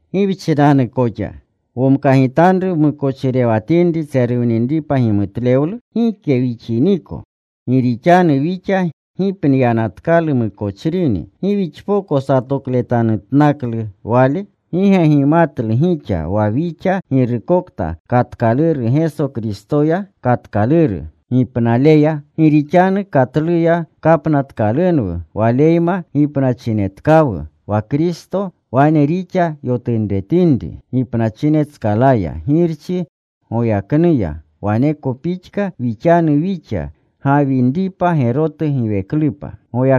¿Gi wchinanu koxa? ¿Womkagitanru wmukochirewatinri tseruwninripa gimutlewlu? Gike wixiniko. Gi rixanu wixa gipniyanatkalu mukochrini. ¿Gi wixpoko satokleyegitanutnaklu wale? ¿Gi ge gimatlu gixa wa wixa girukokta katkaluru Geso Kristoya, katkaluru rupnaleya? Gi rixanu katluya kapnatkalunwu. Waleyma gipnachinetkawu. Wa Kristo wane rixa yotunretinri gipnachinetskalaya Girchi goyaknuya, waneko pixka wixanu wixa: gawinripa gerotu giweklupa.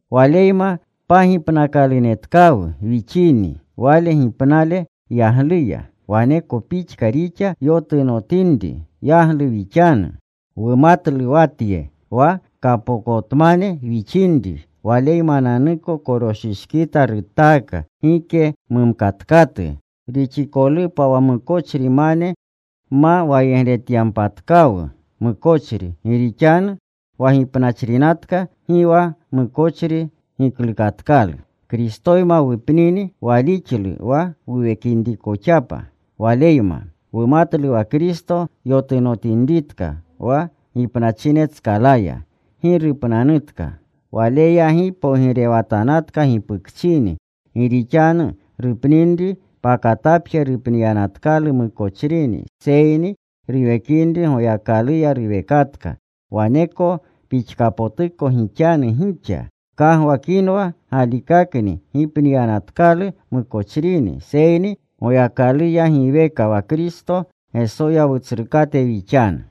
Waleyma pagipnakalunetkawu wixini Wale gipnale yagluya, waneko pixka rixa yotunotinri yaglu wixanu. Wumatlu wa tye: wa kapokotmane wixinri Waleymananuko koroshishkita rutaaka, gike mumkatkatu rixikolupa wa mukochrimane, ma wayegretyanpatkawu mukochri. Gi rixanu wa gipnachrinatka, gi wa mukochri giklukatkalu. Kristoyma wupnini, walixlu wa wuwekinrikoxapa Waleyma. Wumatlu wa Kristo yotunotinritka wa gipnachinetskalaya, gi rupnanutka. Waleya gi pogirewatanatka gipukchini. Gi rixanu rupninri, pakatapje rupniyanatkalu mukochrini, seyni ruwekinri Goyakaluya ruwekatka. Waneko pixkapotuko gixanu gixa. Gkagwakinwa galikakni gipniyanatkalu mukochrini, seyni Goyakaluya giweka wa Kristo Gesoya Wutsrukate wixanu.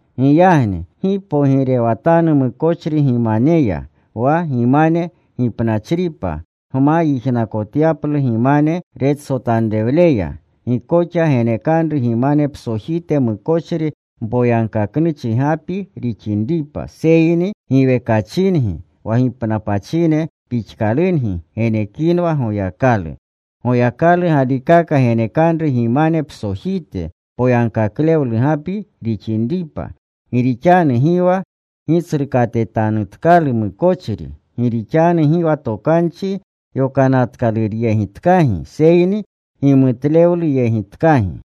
Giyagni gi pogirewatanu mukochri gimaneya wa gimane gipnachripa, gma yijnakotyaplu gimane retsotanrewleya. Gi koxa genekanru gimane psojite mukochri, mpoyagkaknuchi gapi rixinripa, seyni giwekachingi wa gipnapachine pixkalungi genekinwa Goyakalu. Goyakalu galikaka genekanru gimane psojite poyagkaklewlu gapi rixinripa. Gi rixanu gi wa gitsrukatetanutkalu mukochri. Gi rixanu gi wa Tokanchi Yokanatkaluruyegitkagi, seyni gimutlewluyegitkagi.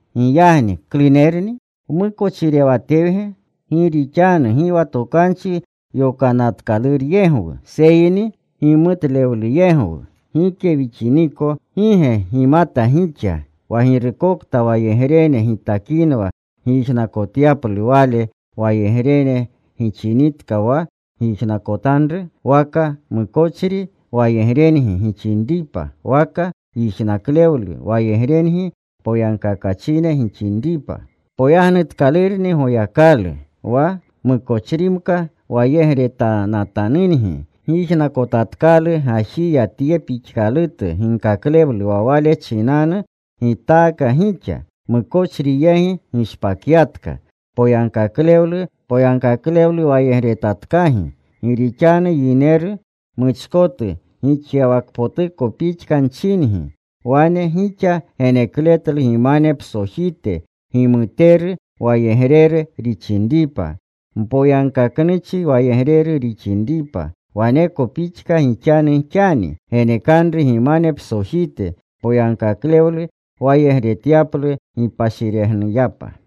Giyagni ¿klunerni? ¿Wmukochirewatewge gi rixanu gi wa Tokanchi Yokanatkaluryegwu, seyni gimutlewluyegwu? Gike wixiniko. ¿Gi ge gimata gixa wa girukokta wayegrene gitakinwa gyijnakotyaplu, wale wayegrene gixinitka wa gyijnakotanru? Waka mukochri wayegrengi gixinripa, waka yijnaklewlu wayegrengi poyagkakachine gixinripa. Poyagnutkalurni Goyakalu, wa mukochrimka wayegretanatanungi, gyijnakotatkalu gajiya tye pixkalutu ginkaklewlu wa wale chinanu gitaaka gixa. Mukochri yegi gishpakyatka. Poyagkaklewlu wayegretatkagi. Gi rixanu yineru muchkotu gixyawakpotuko pixka nchingi. Wane gixa genekletlu gimane psojite gimuteru wayegreru rixinripa, mpoyagkaknuchi wayegreru rixinripa, waneko pixka gixanu xani. Genekanru gimane psojite poyagkaklewlu wayegretyaplu gipashiregnuyapa.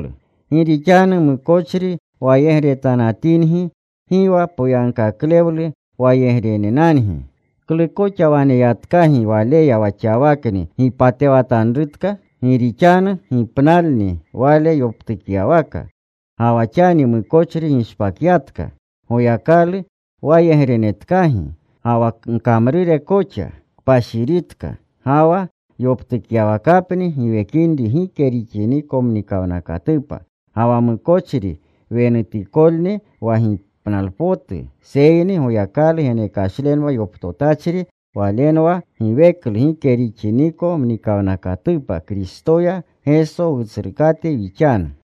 Gi rixanu mukochri wayegretanatingi, gi wa poyagkaklewlu wayegrenenangi. ¿Klu koxa waneyatkagi waleya, wa xawakni gipatewatanrutka? Gi rixanu gipnalni wale yoptukyawaka. Ga wa xani mukochri gishpakyatka. Goyakalu wayegrenetkagi. Ga wa gkamrure koxa kpashiritka. Ga wa yoptukyawakapni giwekinri gike rixiniko mnikawnakatupa. Ga wa mukochri wenutikolni wa gipnalpotu, seyni Goyakalu genekashle yoptotachri walenwa giweklu gike rixiniko mnikawnakatupa Kristoya Geso Wutsrukate wixanu.